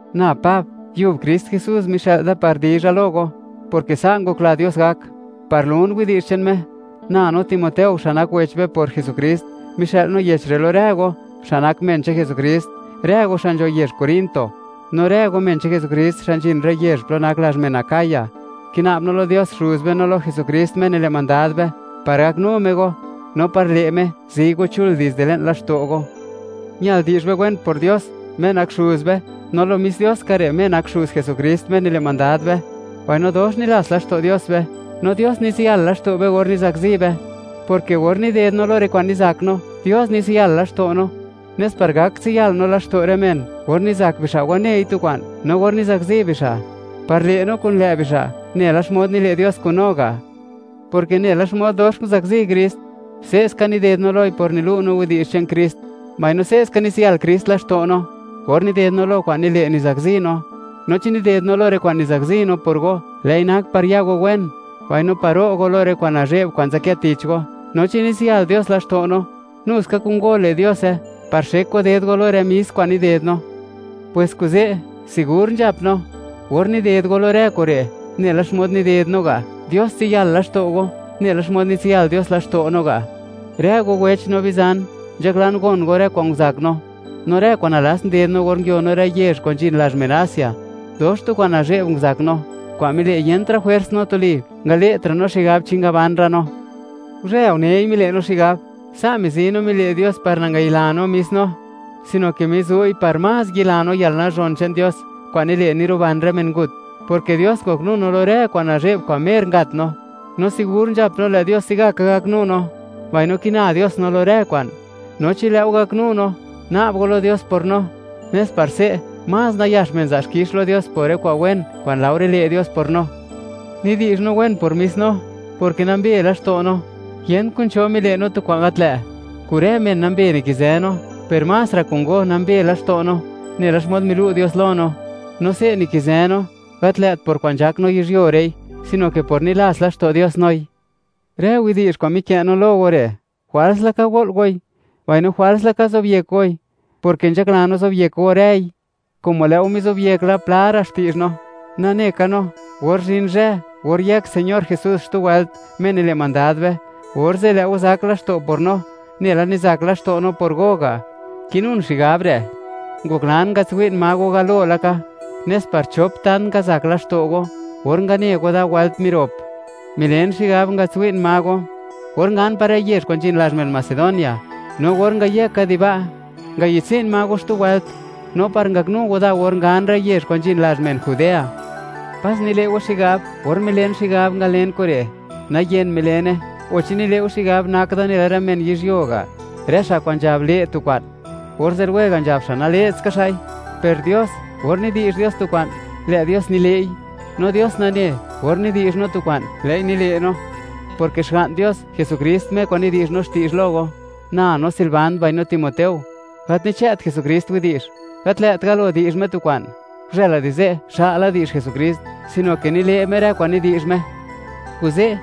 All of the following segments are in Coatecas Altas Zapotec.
Na Pab, yub Krist Jesús mixë'l da par dizha lo go, porke sa' ngokla Dios gak, par lun widi'zh che'n Me. Na no Timoteo, xa' nak wech be por Jesukrist; mixë'l no yech re' lo rë go, xa' nak men che'n Jesukrist, rë go xa' nzho yezh Corinto, no rë go men che'n Jesukrist xa' nzhin rë yezh plo nak lazh men Acaya. Kina'b no lo Dios, Xuz be, no lo Jesukrist, Me nile' mandad be, par gaknu Me go, no par le' Me, zi go chul dizde le'n laxto' go. Ñal di'zh be wen por Dios, Me nak Xuz be, no lo mis Dios ska re', Me nak Xuz Jesukrist, Me nile' mandad be, mbaino dox nilats laxto' Dios be, no Dios nitsiyal laxto' be or nizakzi be, porke or nided no lo rë kwa'n nizak no, Dios nitsiyal laxto' no, nes par gak tsiyal no laxto' rë men, or nizak bixa' wanei tu kwa'n. No or nizakzi bixa', par le' no kun lë' bixa', nela xmod nile' Dios kun go ga'. Porke nela xmod, dox nguzakzi Krist, se'ska nided no loi por nilu' no widi'zh che'n Krist, mbaino se'ska nitsiyal Krist laxto' no or nided no lo kwa'n nile' nizakzi no. No chi nided no lo rë kwa'n nizakzi no por go, lë'i nak par ya go wen, mbaino par ro' go lo rë kwa'n nazhe'b kwa'n nzadkë tich go. No chi nitsiyal Dios laxto' no, nu ska kun go le' Diose, par xek go ded go lo rë mis kwa'n nided no. Pwes kuze', sigur nzhap no, or nided go lo rë kure', nela xmod nided no ga', Dios tsiyal laxto' go, nela xmod nitsiyal Dios laxto' no ga'. Rë go wech no bizan, nzhaklan gon go rë kwa'n nguzak no, no rë kwa'n nalats nguded no or nguio no rë yezh kwa'n zhin lazh men Asia. Dox tu kwa'n nazhe'b nguzak no, kwa'n mile' yentra' jwers no tuli, ngale'tra' no xigab chi ngabanra' no. Guzhë unei, mile' no xigab; sa' mizi no mile' Dios par nangayila no mis no, sino ke mizu'i par más yila no yalnazhon che'n Dios, kwa'n nile', niruban rë men ngut, porke Dios ngoknu no lo rë kwa'n nazhe'b kwa'n mer ngat no, no sigur nzhap no, lë' Dios se'gaka gaknu no, mbaino kina Dios no lo rë kwa'n, no chi lë' go gaknu no, na'b go lo Dios por no, nes par se', más nayax men za' xkix lo Dios por rë kwa'n wen, kwa'n laore le' Dios por no. Nidi'zh no wen por mis no, porke nambe laxto' no, yent kun cho mile' no tu kwa'n gat lë'; kun rë men nambe nikizë no, per más ra' kun go nambe laxto' no, nela xmod milu' Dios lo no. No se' nikizë no, gat lë't por kwa'n nzhak no yizhyuo re'i, sino ke por nilats laxto' Dios noi. Rë widi'zh kwa'n mikë' no lo go re', jwals laka go'l goi, mbaino jwals laka zobyek goi, porke nzhakla no zobyek go rëi. Como lë' go mizobyek la, pla ra' xti'zh no; nane ka no, or zhin zhë or yëk Señor Jesús xtu wëlt, Me nile' mandad be, orze' lë' go zak laxto' por no, nela nizak laxto' no por go ga'. Kinun xigab re', ngoklan ngatswi'n ma go galo laka; nes par chop tant ngazak laxto' go, or ngane go da wëlt mirop. Milen xigab, ngatswi'n ma go, or ngan par rë yezh kwa'n nzhin lazh men Macedonia; no or ngayëka di ba', ngayi'dtsi'n ma go xtu wëlt, no par ngaknu go da or ngan rë yezh kwa'n nzhin lazh men Judea. Pas nile' go xigab, or milen xigab, ngalen kure', nayen milene, o chi nile' go xigab, nak da nela rë men yizhyuo ga', rë xa' kwa'n nzhab le' tu kwa'n, orze' lwega' nzhab xa' nale'tska xa'i. Per Dios, or nidi'zh Dios tu kwa'n, lë' Dios nile'i, no Dios nane, or nidi'zh no tu kwa'n, lë'i nile' no, porke Xga'n Dios, Jesukrist, Me kwa'n nidi'zh no xti'zh lo go, na no Silvan, mbaino Timoteo; gat nichë't Jesukrist widi'zh, gat lë't galo di'zh Me tu kwa'n, guzhëla di ze' xa'la di'zh Jesukrist, sino ke nile' Me rë kwa'n nidi'zh Me. Kuze',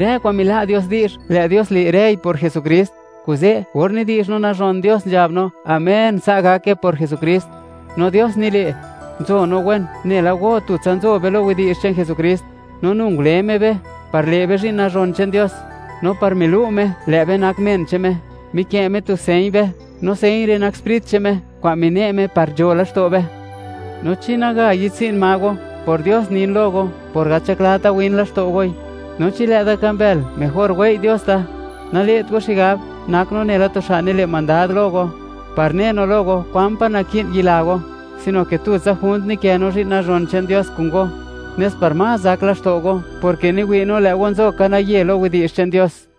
rë kwa'n mila' Dios di'zh, lë' Dios le' rëi por Jesukrist. Kuze', or nidi'zh no nazhon Dios, nzhab no: “Amén, sa' gake”, por Jesukrist. No Dios nile', nzo no wen nela go tutsa nzo be lo widi'zh che'n Jesukrist, no nu ngule Me be, par le' be zhi'n nazhon che'n Dios, no par milu' Me, lë' be nak men che'n Me, mikë' Me tu señ be, no señ re' nak Sprit che'n Me kwa'n mine' Me par nzho laxto' be. No chi naga yi'dtsi'n ma go, por Dios nin lo go, por gat nzhaklata win laxto' goi. No chi lë' da ka mbël, mejor wei' Dios da. Nale't go xigab, nak no nela tu xa' nile' mandad lo go, par ne no lo go, kwan pa' naki'n yila go, sino ke tutsa junt nikë no zhi'n nazhon che'n Dios kun go, nes par más zak laxto' go, porke niwi' no, lë' go nzo ka naye lo widi'zh che'n Dios.